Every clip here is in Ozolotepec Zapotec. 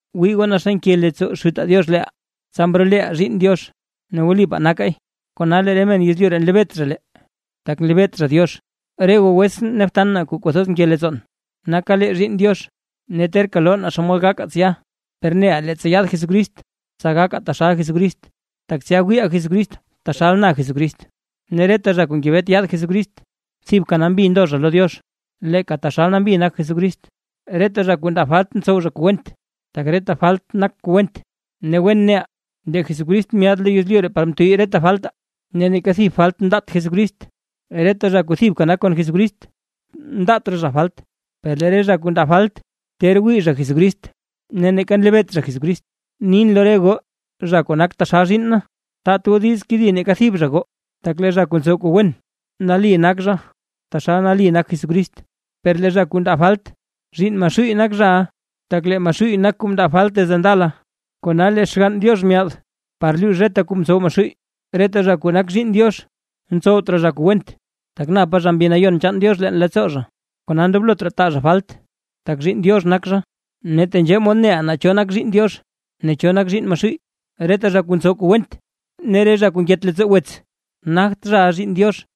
¡Wii goo, naa xa nke leettsoo Xutaa Diox leeʼaa, tsa mroleʼaa zhiinn Diox! ¡Ne wlipaa nakaay! Kona lee re men yezlyu ree nlebeet zha lee, tak nlebeet zha Diox. Re goo wetsʼn ne btan na kuu kwathoz nke leettsoon, naka lee zhiinn Diox; ne terka loo naa xomod gakaa tsya. Per neʼaa leettsa yaad Jesucrist, tsa gakaa taxal Jesucrist, tak tsya wiiʼaa Jesucrist taxal na Jesucrist. Ne reta zha kuu ngebet yaad Jesucrist, thibka nambi ndo zha lo Diox, leeka taxal nambi nak Jesucrist. Reta zha kuu ndaa falt ntsow zha kuu went, tak reta falt nak kuu went. Ne wen neʼaa, lee Jesucrist myaad lo yezlyu ree par mtuyy reta faltaa, ne neeka thib falt mndaat Jesucrist. Reta zha kuu thibka nak kon Jesucrist, ndaat raa zha falt. Per lee re zha kuu ndaa falt, ter wii zha Jesucrist ne neeka nlebeet zha Jesucrist. Nin lo re goo zha kuu nak taxal zhiinn na, taat goo diiz kedi neeka thib zha goo; tak lee zha kuu ntsow kuu wen, nali nak zha taxal nali nak Jesucrist, per lee zha kuu ndaa falt, zhiinn Maxuuy nak zhaʼa, tak lee Maxuuy nak kuu mndaa falt desde ndala. Kona lee Xgann Diox myaad par luux reta kuu ntsow Maxuuy. Reta zha kuu nak zhiinn Diox, ntsowt raa zha kuu went, tak napa zha Mbi Nayon chaan Diox leen leettsoo zha; kona ndoblot raa taa zha falt, tak zhiinn Diox nak zha. Ne tenzhee mod neʼaa naa cho nak zhiinn Diox ne cho nak zhiinn Maxuuy: Reta zha kuu ntsow kuu went, ne re zha kuu nket leettsoo wets, nagt zhaʼa zhiinn Diox.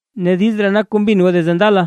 Ne diiz ree nak kuu mbin goo desde ndala: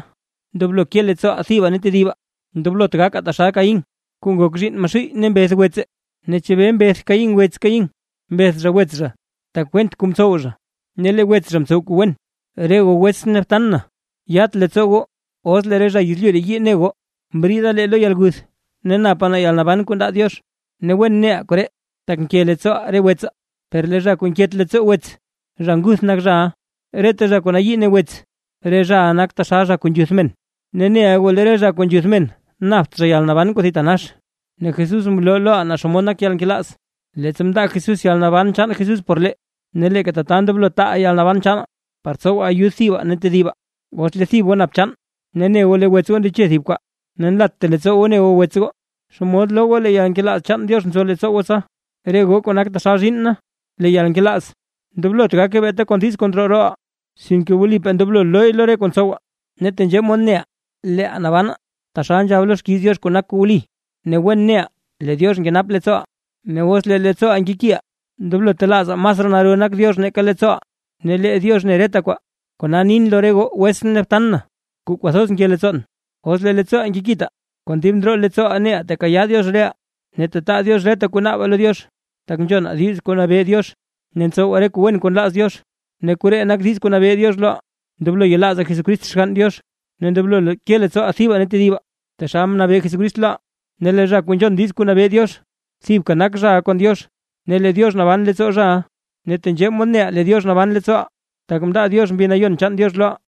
Ndoblo ke leettsooʼaa thibaa ne tedibaa. Ndoblot gakaa taxal Caín kuu ngok zhiinn Maxuuy ne mbeth wetse. ¿Ne chebee mbeth Caín wets Caín? Mbeth zha wets zha, tak went kuu mtsow zha, ne lee wets zha mtsow kuu wen. Re goo wetsʼn ne btan na, yat leettsoo goo os lee re zha yezlyu ree yii ne goo. Mbriida lee lo yalguth ne napa lee yalnaban kuu ndaa Diox, ne wen neʼaa koree, tak nke leettsooʼaa re wetsaa. Per lee zha kuu nket leettsoo wets, zha nguth nak zhaʼa. Reta zha kuu nayii ne wets, re zhaʼa nak taxal zha kuu nzhuth men, ne neʼa goo lee re zha kuu nzhuth men napt zha yalnaban kuu thitanax. Ne Jesús mloo loʼaa naa xomod nak yalnkelaaz, leettsa mndaa Jesús yalnaban chaan Jesús por lee. Ne leeka tata ndoblo taaʼaa yalnaban chaanaa, par tsowaa ayud thibaa ne tedibaa. Os lee thib goo nap chaan, ne ne goo lee wets goo ndeche thib kwaa, ne nlatta leettsoo goo ne goo wets goo, ¿xomod loo goo lee yalnkelaaz chaan Diox nzo leettsoo goo tsa? Re goo kuu nak taxal zhiinn na, lee yalnkelaaz, ndoblot gake beeta kon diiz kuu ndroo rooʼaa; sinke wlipaa ndoblo looy lo re kuu ntsowaa. Ne tenzhee mod neʼaa leeʼaa nabanaa, taxal nzhab lo xkiiz Diox kuu nak kuu wli, ne wen neʼaa lee Diox nkenap leettsooʼaa; ne os lee leettsooʼaa nkekiʼaa, ndoblo telaazaa masraa naro Diox nake leettsooʼaa, ne lee Diox ne reta kwaa. Kona nin lo re goo wetsʼn ne btan kuu kwathoz nke leettsoon, os lee leettsooʼaa nkekitaa, kon dib ndroo leettsooʼaa neʼaa tekayaa Diox reʼaa; ne tetaa Diox reta kuu naabaa lo Diox, tak nzhonaa diiz kuu nabee Diox ne ntsowaa re kuu wen kuu nlaaz Diox. Ne koree nak diiz kuu nabee Diox loʼaa: Ndoblo yelaazaa Jesucrist Xgann Diox ne ndoblo ke leettsooʼaa thibaa ne tedibaa, taxal mnabee Jesucrist loʼaa. Ne lee zha kuu nzhon diiz kuu nabee Diox, thibka nak zhaʼa kon Diox ne lee Diox naban leettsoo zhaʼa. Ne tenzhee mod neʼaa lee Diox naban leettsooʼaa, tak mndaa Diox Mbi Nayon chaan Diox loʼaa.